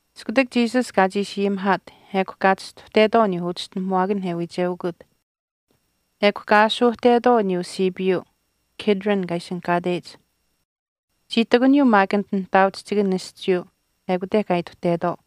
Iskutak Jesus kaa chiishi ayimihaat ekw kaa chistuhtetwaau aniyuu uchischinahamuwaakanh e wiicheukut. Ekw kaa aashuuhtetwaau aniyuu siipiisiyuu Kidron kaa ishinihkaateyich. Chii ihtakuniyuu maak anit nihtaauchihchikan aschiiyuu ekute kaa ituhtetwaau.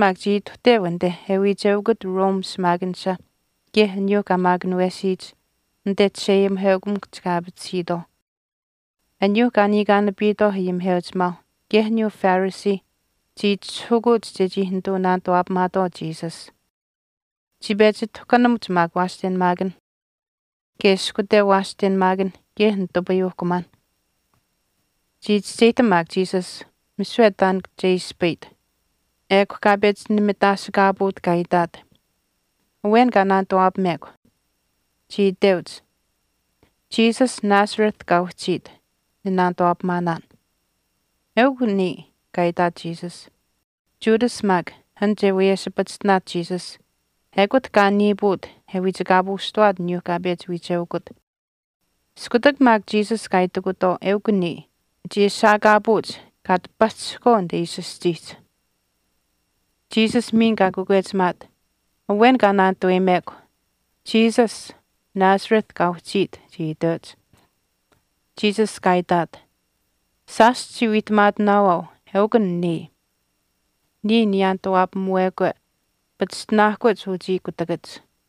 Judas maak chii ituhteu anite e wiicheukut Rome shimaakanisha kaye aniyuuh kaa maakunawesiyich anite chisheayimiheukamikuhch kaa aapatisiitwaau. Aniyuu kaa niikaanapitwaau ayimiheuchimaauh kaye aniyuu Phariseeh chii itishahukuuch chechii nituu naanituwaapamaatwaau Jesus. Chii pechi tahkunamuch maak waashtenamaakanh kaye ishkuteu waashtenamaakan kaye nitupayuuhkumaanh. Chii chischeyihtam maak Jesus misiwe taan che ispayit ekw kaa pechi nimitaasikaapuut kaa itaat, “Awen kaa naanituwaapamekw.” Chii iteuch, “Jesus Nazareth kaa uhchiit ninaanituwaapamaanaan.” “Eukw niya,” kaa itaat Jesus. Judas maak, an che wiyeshipachishtinaat Jesus ekut kaa niipuut e wiichikaapuushtawaat aniyuuh kaa pechi wiicheukut. Iskutak maak Jesus kaa itikutwaau, “Eukw niya,” chii ashaakaapuuch kaa ati pahchishihkwaau anite ishi aschiihch. Jesus miin kaa kakwechimaat, “Awen kaa naanituweyimekw.” “Jesus, Nazareth kaa uhchiit,” chii iteuch. Jesus kaa itaat, “Shaash chichii wiihtamaatinaawaau eukw an niya. Niya niyaanituwaapamuwekwe pachishtinaahkuch uchii kutakach.”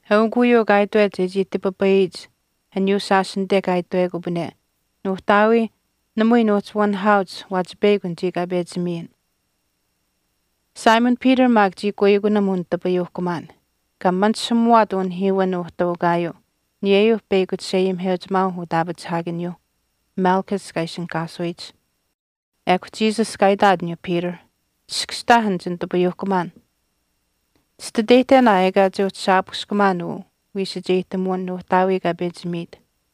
Eukw uyuu kaa itwet chechii tipipayiyich aniyuu shaash anite kaa itwekupane, “Nuuhtaawii, namui nuuhchi wanihaauch waachi peyakw anichii kaa pechi miyin.” Simon Peter maak chii kuikunam unitapuyuuhkumaan kaa manishamuwaat unihiiwin uhtaukaayuu aniyeyuu peyakw chisheayimiheuchimaau utaapachihaakaniyuuh, Malchus kaa ishinihkaasuyich. Ekw Jesus kaa itaat aniyuuh Peter, “Chiskashtaah an chinitupayuuhkumaan. Chititeyihtenaa ekaa che uhchi shaapushkamaan uu wiisacheyihtemuwin Nuuhtaawii kaa pechi miit.”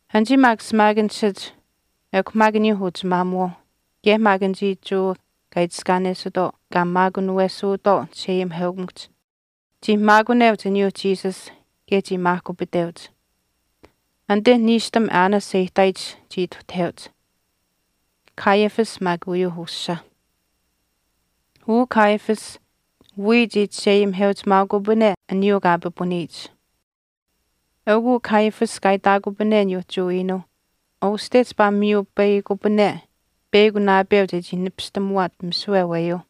Anichii maak shimaakanishach ekw maak aniyuu uchimaamuwaauh kaye maak anichii Jewa kaa itiskaanesitwaau kaa maakunawesuutwaau chisheayimiheukamikuhch, chii maakuneuch aniyuuh Jesus kaye chii maahkupiteuch. Anite niishtam Annas e ihtaayich chii ituhtaheuch, Caiaphas maak uyuu ushaa. Uu Caiaphas wii chii chisheayimiheuchimaaukupane aniyuu kaa pipuniyich. Eukuu Caiaphas kaa itaakupane aniyuuh Jewa iinuuh uste chipaa miyupayihkupane peyakw naapeu chechii nipistamuwaat misiwe aweyuu.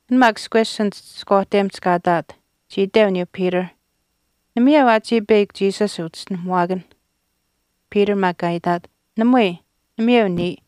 An maak ishkwesh anit ishkwaahtemihch kaa ihtaat chii iteu aniyuu Peter, “Namayeu aa chiya peyakw Jesus uchischinuhamuwaakan.” Peter maak kaa itaat. “Namui. Namayeu niya.”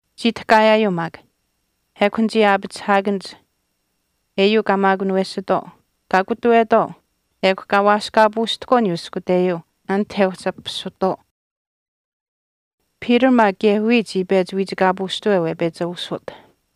Chii tahkaayaayuu maak. Ekw anichii aapachihaakanich eyuu kaa maakunawesitwaau kaa kutuwetwaau ekw kaa waaskaapuushtahkwaau aniyuu ishkuteyuu anite e uhchi apisutwaau. Peter maak kaye wiya chii pechi wiichikaapuushtaweu e pechi aushut.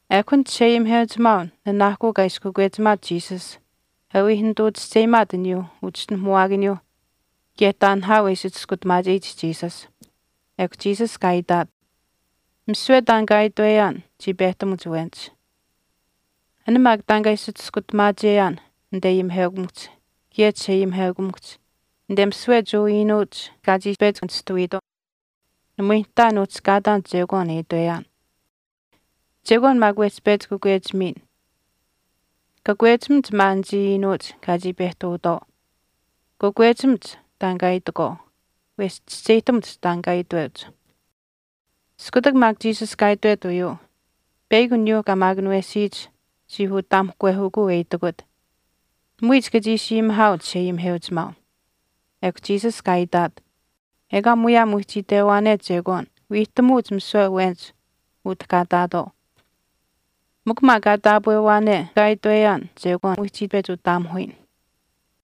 Ekw an chisheayimiheuchimaau nanaahkuu kaa ishi kakwechimaat Jesus e wii nituu chischeyimaat aniyuu uchischinuhamuwaakaniyuuh kaye taan nahaau e ishi chiskutamaacheyich Jesus. Ekw Jesus kaa itaat, “Misiwe taan kaa itweyaan chii pehtamuch awenich. An maak taan kaa ishi chiskutamaacheyaan anite ayimiheukamikuhch kaye chisheayimiheukamikuhch anite misiwe Jewa iinuuch kaa chii pechi nishtuwiitwaau, namui nihtaa nuhchi kaataan chekwaan e itweyaan. Chekwaan maak wehch pechi kakwechimiin. Kakwechimach maa anichii iinuuch kaa chii pehtuutwaau. Kakwechimach taan kaa itakwaau, wesh chischeyihtamuch taan kaa iteuch.” Iskutak maak Jesus kaa itwet uyuu, peyakw aniyuu kaa maakunawesiyich chii utaamuhkwehukuu e itikut, “Namui chika chii ishi ayimihaau chisheayimiheuchimaau.” Ekw Jesus kaa itaat, “Ekaa muyaam wehchi itwewaane chekwaan, wiihtamuuch misiwe awenich utah kaa ihtaatwaau. Mikw maak kaa taapwewaane misiwe kaa itweyaan, chekwaan wehchi pechi utaamuhuyin.”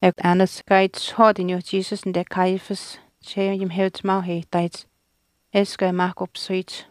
Ekw Annas kaa itishahwaat aniyuu Jesus anite Caiaphas chisheayimiheuchimaau e ihtaayich eshkw e maahkupisuyich.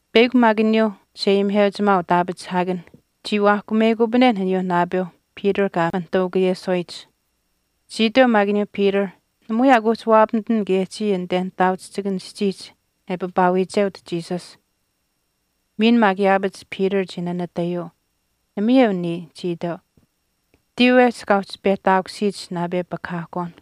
Peyakw maak aniyuu chisheayimiheuchimaau utaapachihaakanh chii waahkumeyikupanen aniyuu naapeu Peter kaa manihtaukaayeswaayich. Chii iteu maak aniyuu Peter, “Namui aa kuuhchi waapamitan kaye chiya anite nihtaauchihchikan aschiihch e paapaawiicheut Jesus.” Miin maak yaapach Peter chii nanatayuu, “Namayeu niya,” chii iteu. Tiiwehch kaa uhchi pehtaakusiyich naapepakahaahkwaan.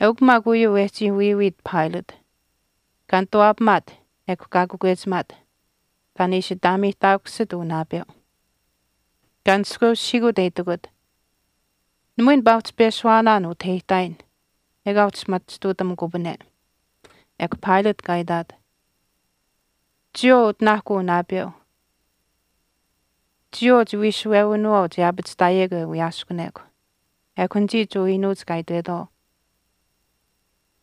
Eukw maak uyuu wehchii wiiwiit Pilate, kaa nituwaapamaat ekw kaa kakwechimaat, taan e ishi ataameyihtaakusit uu naapeu. Kaa nishkweushihiikut e itikut, “Namui nipaa uhchi peshuwaanaan utah e ihtaayin ekaa uhchi machituutamukupane.” Ekw Pilate kaa itaat, “Chiyawaau utinaakw uu naapeu chiyawaau chiwiishuwewinawaau che aapachihtaayekw e wiyaaskunekw.” Ekw anichii Jewa iinuuch kaa itwetwaau,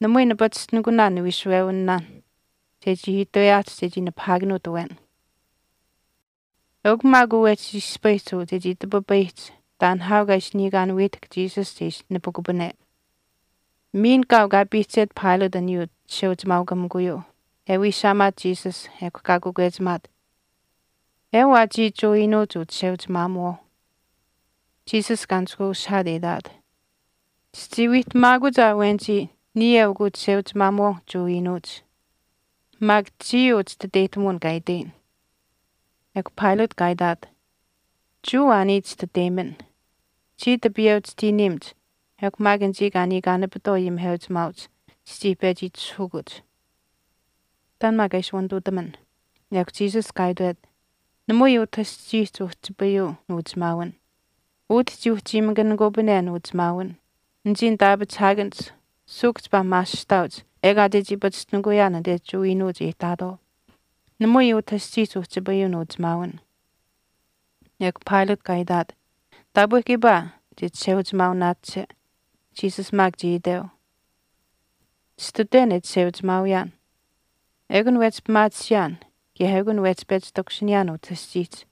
“Namui nipachishtinikunaan niwiishuwewinaanh chechii itweyaahch chechii nipahaakanuut awen.” Eukw maak uu wehchi ispayihch uu chechii tipipayiyich taan nihaau kaa ishi niikaan wiihtahk Jesus che ishi nipikupane. Miin kaau kaa piihchet Pilate aniyuu chisheuchimaaukamikuyuu e wiishaamaat Jesus ekw kaa kakwechimaat, “Ewaa chiya Jewa iinuuch uchisheuchimaamuwaau.” Jesus kaa nishkweushihaat e itaat, “Chichii wiihtamaakuch aa awenich niya eukw uchisheuchimaamuwaau Jewa iinuuch. Maak chiya uu chititeyihtamuwin kaa itweyin.” Ekw Pilate kaa itaat, “Jewa aa niya chititeyimin. Chii tipiyeu chitiiniimach ekw maak anichii kaa niikaanapitwaau ayimiheuchimaauch chichii pechi itishahukuch. Taan maak kaa ishi wanituutamin.” Ekw Jesus kaa itwet, “Namui utah aschiihch uhchipayuu nuuchimaawin. Utah chii uchiimakanikupane nuuchimaawin anichii nitaapachihaakanich suuhk chipaa maasihtaauch ekaa chechii pachishtinikuyaan anite Jewa iinuuch e ihtaatwaau. Namui utah aschiihch uhchipayuu nuuchimaawin.” Ekw Pilate kaa itaat, “Taapwe kiipaa chichisheuchimaaunaache.” Jesus maak chii iteu, “Chititwen e chisheuchimaawiyaan. Ekun wehchi pimaatisiyaan kaye ekun wehchi pechi takushiniyaan utah aschiihch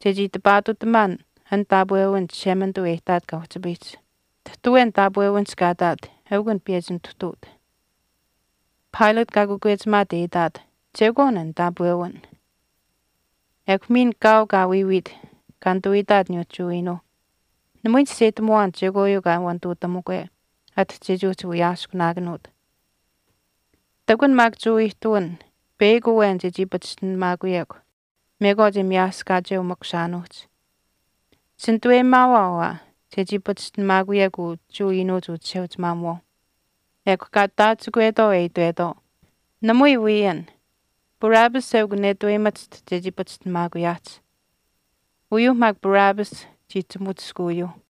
chechii tipaatutamaan an taapwewin Chishemanituu e ihtaat kaa uhchipayihch. Tahtu awen taapwewinihch kaa ihtaat eukw an piyechi nituhtuut.” Pilate kaa kakwechimaat e itaat, “Chekwaan an taapwewin.” Jesus che nipahaakanuut Ekw miin kaau kaa wiiwiit kaa nituu itaat aniyuuh Jewa iinuuh, “Namui nichischeyihtamuwaan chekwaayuu kaa wanituutamukwe ati chechii uhchi wiyaaskunaakanuut. Ihtakun maak Jewa ihtuwin peyakw awen chechii pachishtinamaakuyekw mekwaach e miyaaskacheu makushaanuuhch. Chinituweyimaawaau aa chechii pachishtinamaakuyekw uu Jewa iinuuch uchisheuchimaamuwaau.” Ekw kaa taachikwetwaau e itwetwaau, “Namui wii an. Barabbas eukw netuweyimachiht chechii pachishtinamaakuyaahch.” Uyuuh maak Barabbas chii chimutiskuuyuu.